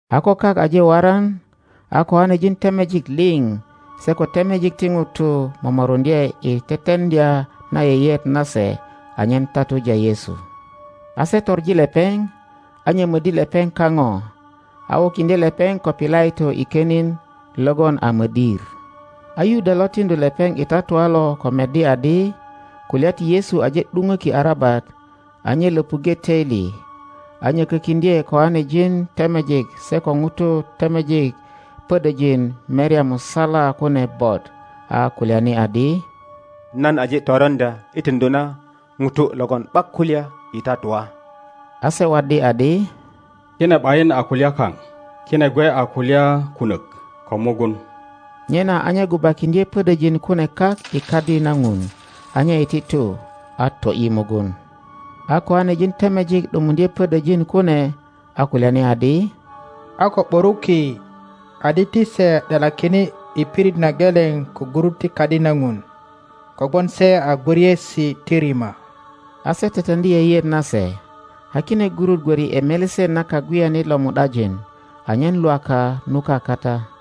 A ko kak aje waran, a kiŋanejin temejik liŋ se ko temejik ti ŋutu momoruŋdye i teteŋdya na yeyeet nase anyen tatuja Yesu; a se toŋi lepeŋ, a nyomöddi lepeŋ kaŋo, a wukiŋdye lepeŋ ko Pilato i konin logon a mödir. A Yuda lo tiŋdu lepeŋ i tatua lo ko meddi adi kulya ti Yesu aje ’dupöki arabat, a nye löpuŋge töili, a nyökökiŋdye koanejin temejik se ko ŋutu temejik pödöjin merya musala kune bot, a kulyani adi, Nan aje toroŋdya i tiŋdu na ŋuto logon ’bak kulya i tatua. A se waddi adi, Kine ’bayin a kulyan kaŋ. Kine gwe a kulya kunök ko mugun. Nyena a nye gubakiŋdye pödöjin kune kak i Kadi na Ŋun. a nye iti tu, a to ’yi mugun. A koanejin temejik ’dumuŋdye pödöjin kune, a kulyani adi, A ko ’buruki adi ti se ’delakine i pirit na geleŋ ko gurut ti Kadi na Ŋun, kogwon se a gwöriesi ti rima. a se teteŋdi yeyeet nase, a kine gurut gwörwe ’i melesen na kagweyanit lo mu ’dajin, anyen Lwaka nuka kata.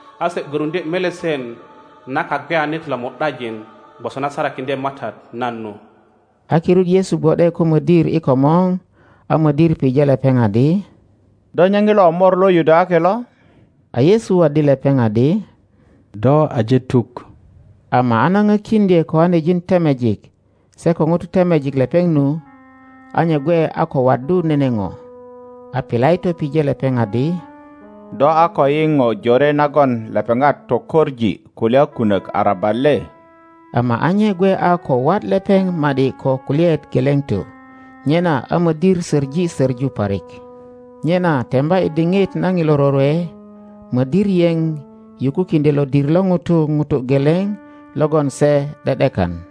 a se gwöruŋdye melesen na kagweyanit lo mu ’dajin, gwoso na sarakiŋdye MATAT nan nu. A kirut Yesu gwo ’de ko modir i komor, a mödir pije lepeŋ adi, Do nye ŋilo Mor lo Yudayaki lo? A Yesu waddi lepeŋadi, Do aje tuk. Ama a na pökiŋdye kijanejin temejik se ko ŋutu temejik lepeŋ nu, a nye gwe a ko waddu nene po. A Pilato pije lepeŋ adi, Do a ko yiŋ po jore nagon lepeŋat tokoŋ kulya kunök arabat le? Ama a nye gwe a ko wat lepeŋ ma ’di ko kulyaet geleŋ to; nyena a mödir söŋi söŋu parik. Nyena temba i diŋit na ŋilo rorwe, mödir yeŋ yukukiŋdyö lodir lo ŋutu ŋuto geleŋ logon se ’de ’dekan.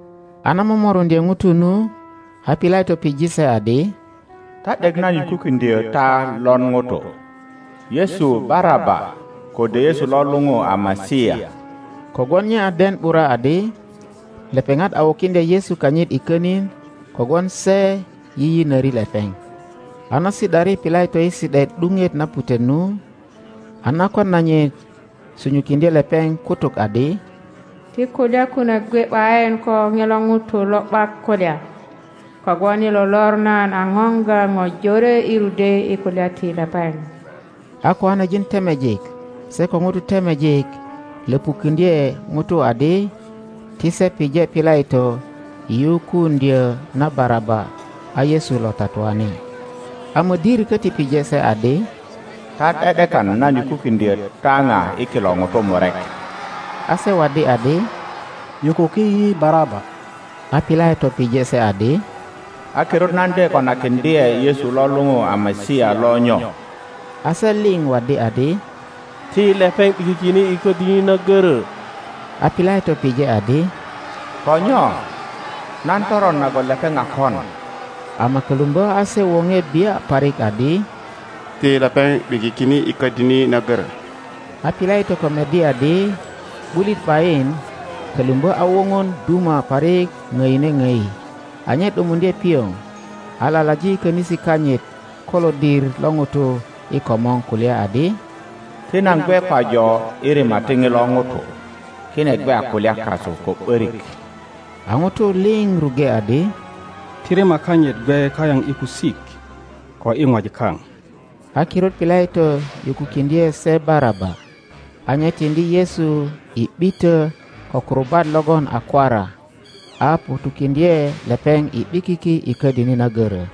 a na momoruŋdye ŋutu nu, a Pilato pije se adi, Ta ’dek nan yukukiŋdyö ta lon ŋuto, Yesu Baraba, kode Yesu lo lupu a Masia? Kogwon nye a den ’bura adi lepeŋat a wukiŋdya Yesu kanyit i könin kogwon se yiyinöri lepeŋ. A na si ’dari Pilato i si ’daet ’dupet na putet nu, a nakwan nanyit sunyukiŋdye lepeŋ kutuk adi, Ti kulya kunök gwe ’bayin ko ŋilo ŋuto lo ’bak kulya, kogwon i lo lor nan a poŋga po jore i rudwe i kulya ti lepeŋ. A kiŋanejin temejik se ko ŋutu temejik löpukuŋdye ŋutu adi ti se pije Pilato i yukuuŋdyö na Baraba, a Yesu lo tatuani, a mödir köti pije se adi, Ta ’de ’dekan nan yukukiŋdyö ta ŋa i kilo ŋutu murek? A se waddi adi, Yukuki yi Baraba! a Pilato pije se adi, A kirut nan de konakiŋdye Yesu lo luŋu a Masia lo nyo? A se liŋ waddi adi, Ti lepeŋ ’bikikine i ködini na görö! a Pilato pije adi, Ko nyo? Nan toron nagon lepeŋ a kon? Ama kölumbö a se woŋe bia parik adi, Ti lepeŋ ’bikikine i ködini na görö. A Pilato ko meddi adi ’bulit ’bayin, kölumbö a woŋon duma parik ŋdine ŋdi, a nye ’dumuŋdye pioŋ, a lalaji könisi kanyit ko lodir lo ŋutu i komor, kulya adi, Ti nan gwe pajo i rima ti ŋilo ŋuto. Kine gwe a kulya kasu ko ’börik. A ŋutu liŋ ruŋge adi, Ti rima kanyit gwe kayaŋ i kusik ko i ŋwajik kaŋ. A kirut Pilato yukukiŋdye se Baraba, a nye tiŋdi Yesu i ’bitö ko kurubat logon a kwara, a ŋutukiŋdye lepeŋ i ’bikiki i ködini na görö.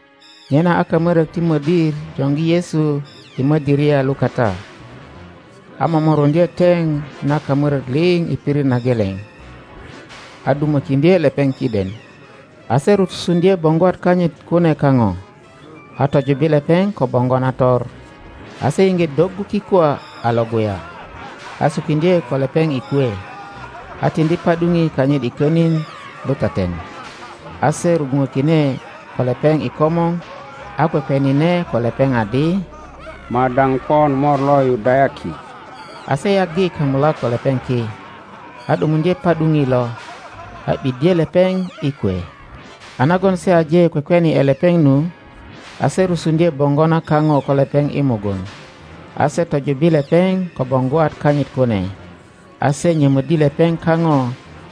Nyena a kamörök ti mödir joŋgi Yesu i mödöria lukata, a momoruŋdye teŋ na kamörök liŋ i pirit na geleŋ, a dumökiŋdye lepeŋ kiden. a se rusuŋdye boŋgwat kanyit kune kaŋo, a tojubbi lepeŋ ko boŋgo nator; a se iŋge doggu kikwa a Iŋguya, a sukiŋdye ko lepeŋ i kwe. a tiŋdi pa ’duŋi kanyit i könin lutaten; a se rugwuŋökine ko lepeŋ i komor, a kwekwenine ko lepeŋ adi, Madaŋ pon Mor lo Yudayaki! A se yaggi kamulak ko lepeŋ ki, a ’dumuŋdye pa ’duŋi lo, a ’biddye lepeŋ i kwe. a nagon se aje kwekweni ’e lepeŋ nu, a se rusuŋdye boŋgo na kaŋo ko lepeŋ i mugun, a se tojubbi lepeŋ ko boŋgwat kanyit kune, a se nyömöddi lepeŋ kaŋo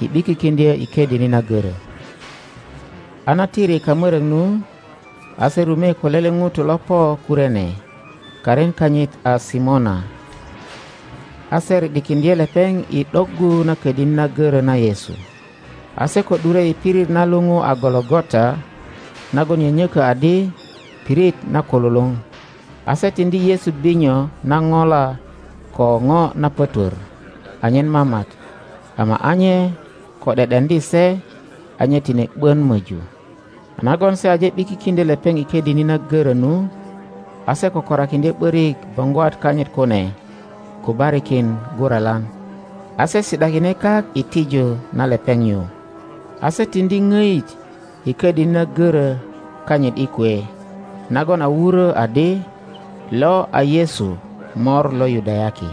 i ’bikikiŋdyö i ködini na görö. A na tiri kamörök nu, a se rume ko lele ŋuto lo po Kurene, karin kanyit a Simona. A se ri ’dikiŋdye lepeŋ i ’doggu na ködini na görö na Yesu. A se ko ’dure i pirit na luŋu a Golo gota (nagon nyönyökö adi Pirit na Kululuŋ), a se tiŋdi Yesu binyo na ŋola ko ŋo na pötwör anyen mamat; ama a nye ko ’de ’deŋdi se, a nye tine ’bön möju. a nagon se aje ’bikikindyö lepeŋ i ködini na görö nu, a se kökorakiŋdye ’börik boŋgwat kanyit kune gubarikin guralan. a se si ’dakine kak i tiju na lepeŋ nyu. a se tiŋdi ŋoit i ködini na görö kanyit i kwe, nagon a wurö adi, LÖ A YESU MÖR LÖ YUDAYAKI.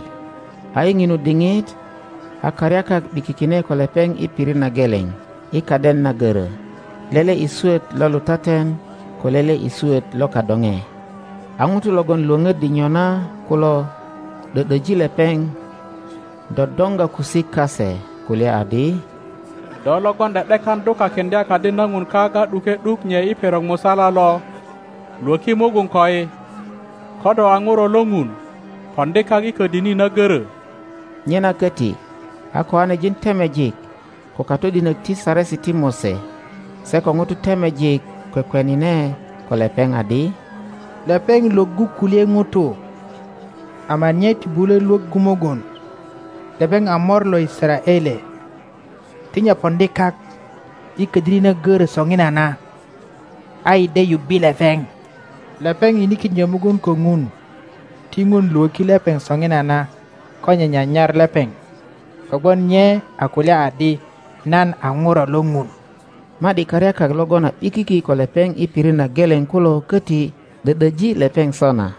A i ŋinu diŋit a karyakak ’bikikine ko lepeŋ i pirit na geleŋ i kaden na görö, lele i swöt lo lutaten ko lele i swöt lo kadoŋe. a ŋutu logon lwöŋöddi nyona kulo ’dö ’döji lepeŋ, dodoŋga kusik kase, kulya adi, Do logon ’de ’dekan dukakiŋdya Kadi na Ŋun kak a ’duke ’duk nye i perok musala lo! Lwöki mugun koi! Ko do a ŋuro lo Ŋun, poŋdi kak i ködini na görö! Nyena köti a kiŋanejin temejik, ko katodinök ti Saresi ti Mose, se ko ŋutu temejik kwekwenine ko lepeŋ adi, Lepeŋ lwöggu kulye ŋutu; ama nye ti bulö lwöggu mugun. Lepeŋ a Mor lo Yisaraele! Ti nye poŋdi kak i ködini na görö soŋinana, a yi de yubbe lepeŋ. Lepeŋ yinikiŋdyö mugun ko Ŋun, ti Ŋun lwöki lepeŋ soŋinana ko nye nyanyar lepeŋ; kogwon nye a kulya adi, Nan a Ŋuro lo Ŋun. Ma ’di karyakak logon a ’bikiki ko lepeŋ i pirit na geleŋ kulo köti ’dö ’döji lepeŋ sona.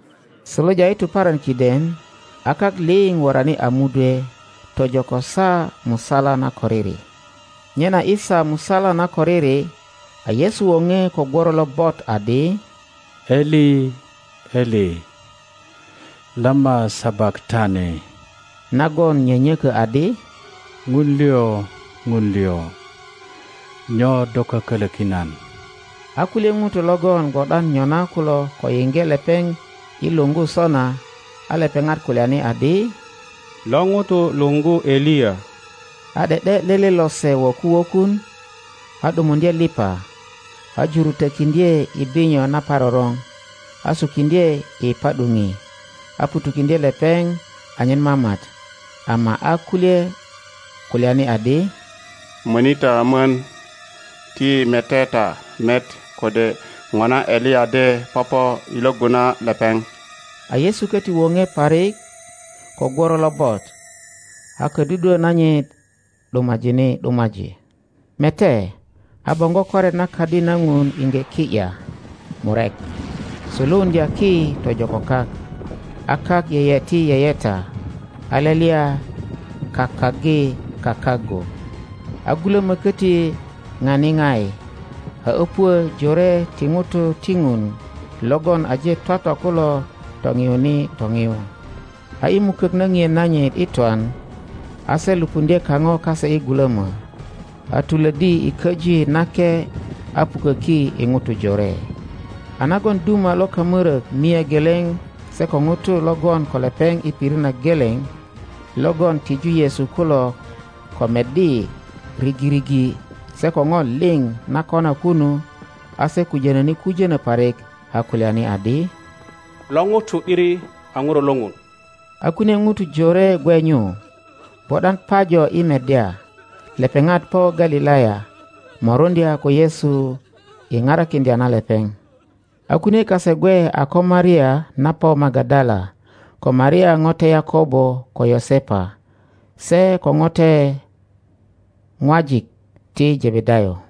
Suluja i tuparan kiden a kak liŋ worani a mudwe tojo ko saa musala na koriri. Nyena i saa musala na koriri, a Yesu woŋe ko gworo lobot adi, Eli, Eli, lama sabakatani? nagon nyönyökö adi, Ŋun liŋ, Ŋun liŋ, nyo do kökölökin nan? a kulye ŋutu logon gwo ’dan nyona kulo ko yiŋge lepeŋ i luŋgu sona, a lepeŋat kulyani adi, Lo ŋuto luŋgu Eliya. a ’de ’de lele lose wöku wökun, a ’dumuŋdye liŋ a, a jurutökiŋdye i binyo naparoroŋ, a sukiŋdye i pa ’duŋi, a ŋutukiŋdye lepeŋ anyen mamat. Ama a kulye kulyani adi, Möni ta mon, ti yi mete ta met kode ŋona Eliya de popo i lwöggu na lepeŋ. a Yesu köti woŋe parik ko gworo lobot, a kodudwö nanyit ’dumajine ’dumaji. Mete, a boŋgo koret na Kadi na Ŋun iŋge ki ’ya murek, suluuŋdya ki tojo ko kak, a kak yeyeti yeyeta, a lelya kakaggi kakaggu, a gulömö köti ŋani ŋai, a öpuö jore ti ŋutu ti Ŋun logon aje twatwa kulo topiyuni topiyu; a i mukök na ŋien nanyit i twan, a se lupuŋdye kaŋo kase i gulömö, a tulöddi i Köji Nake a puköki i ŋutu jore. a nagon duma lo kamörök mia geleŋ se ko ŋutu lo gwon ko lepeŋ i pirit na geleŋ, logon tiju Yesu kulo, ko meddi rigirigi se ko po liŋ na kona kunu, a se kujönöni kujönö parik, a kulyani adi, Lo ŋuto ’diri a ŋuro lo Ŋun! A kunie ŋutu jore gwe nyu, gwo ’dan pajo i meddya. Lepeŋat po Galilaya moruŋdya ko Yesu i parakiŋdya na lepeŋ. a kunie kase gwe a ko Maria na po Magadala, ko Maria ŋote Yakobo ko Yosepa, se ko ŋote ŋwajik ti Jebedayo.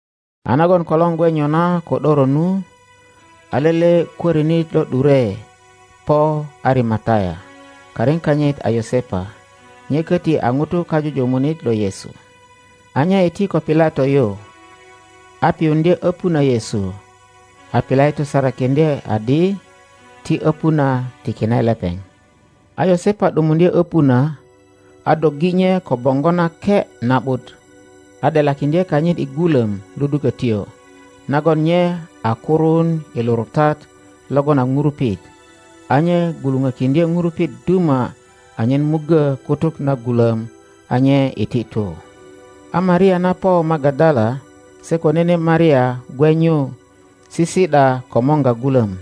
A nagon kolor gwe nyona ko ’doro nu, a lele kwörinit lo ’dure po Arimataya, karin kanyit a Yosepa. Nye köti a ŋuto kajujumunit lo Yesu. A nye iti ko Pilato yu a piyuŋdye öpu na Yesu. A Pilato sarakiŋdye adi ti öpu na tikine lepeŋ. a Yosepa ’dumuŋdye öpu na, a doggi nye ko boŋgo nake na ’but, a ’delakiŋdye kanyit i gulöm ludukötyo, nagon nye a kuruun i lurutat logon a ŋurupit; a nye gwuluŋökiŋdye ŋurupit duma anyen muggö kutuk na gulöm, a nye iti tu. A Maria na po Magadala se ko nene Maria gwe nyu, sisi ’da komorga gulöm.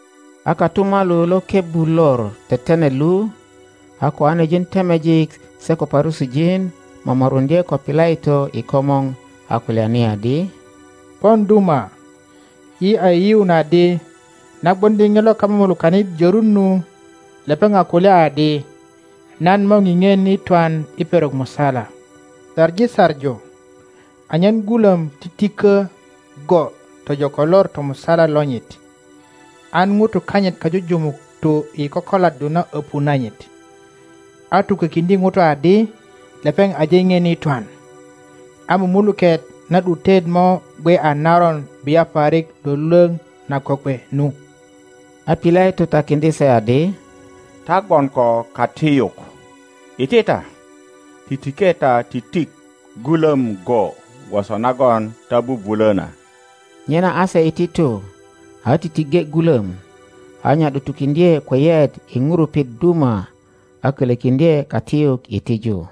A kotumalu lo kebbu Lor Tetenet lu, a kiŋanejin temejik se ko Parusijin momoruŋdye ko Pilato i komor, a kulyani adi, Pon duma, yi a yiyiun adi, na gwoŋdi ŋilo kamumulukanit jörun nu, lepeŋ a kulya adi, Nan mo pipien i twan i perok musala. Saŋi saŋu anyen gulöm titikö go tojo ko lor tomusala lonyit, an ŋutu kanyit kajujumuk tu i kokoladdu na öpu nanyit, a tukökiŋdye ŋutu adi, Lepeŋ aje ŋien i twan; a mumuluket na ’dutet mo gwe a naron bia parik lwölwöŋ na kokwe nu. a Pilato takiŋdye se adi, Ta gwon ko katiyuk. Iti ta, titike ta titik gulöm go gwoso nagon ta bubulö na. Nyena a se iti tu, a titiŋge gulöm, a nya ’dutukiŋdye kweyet i ŋurupit duma, a kölökiŋdye katiyuk i tiju.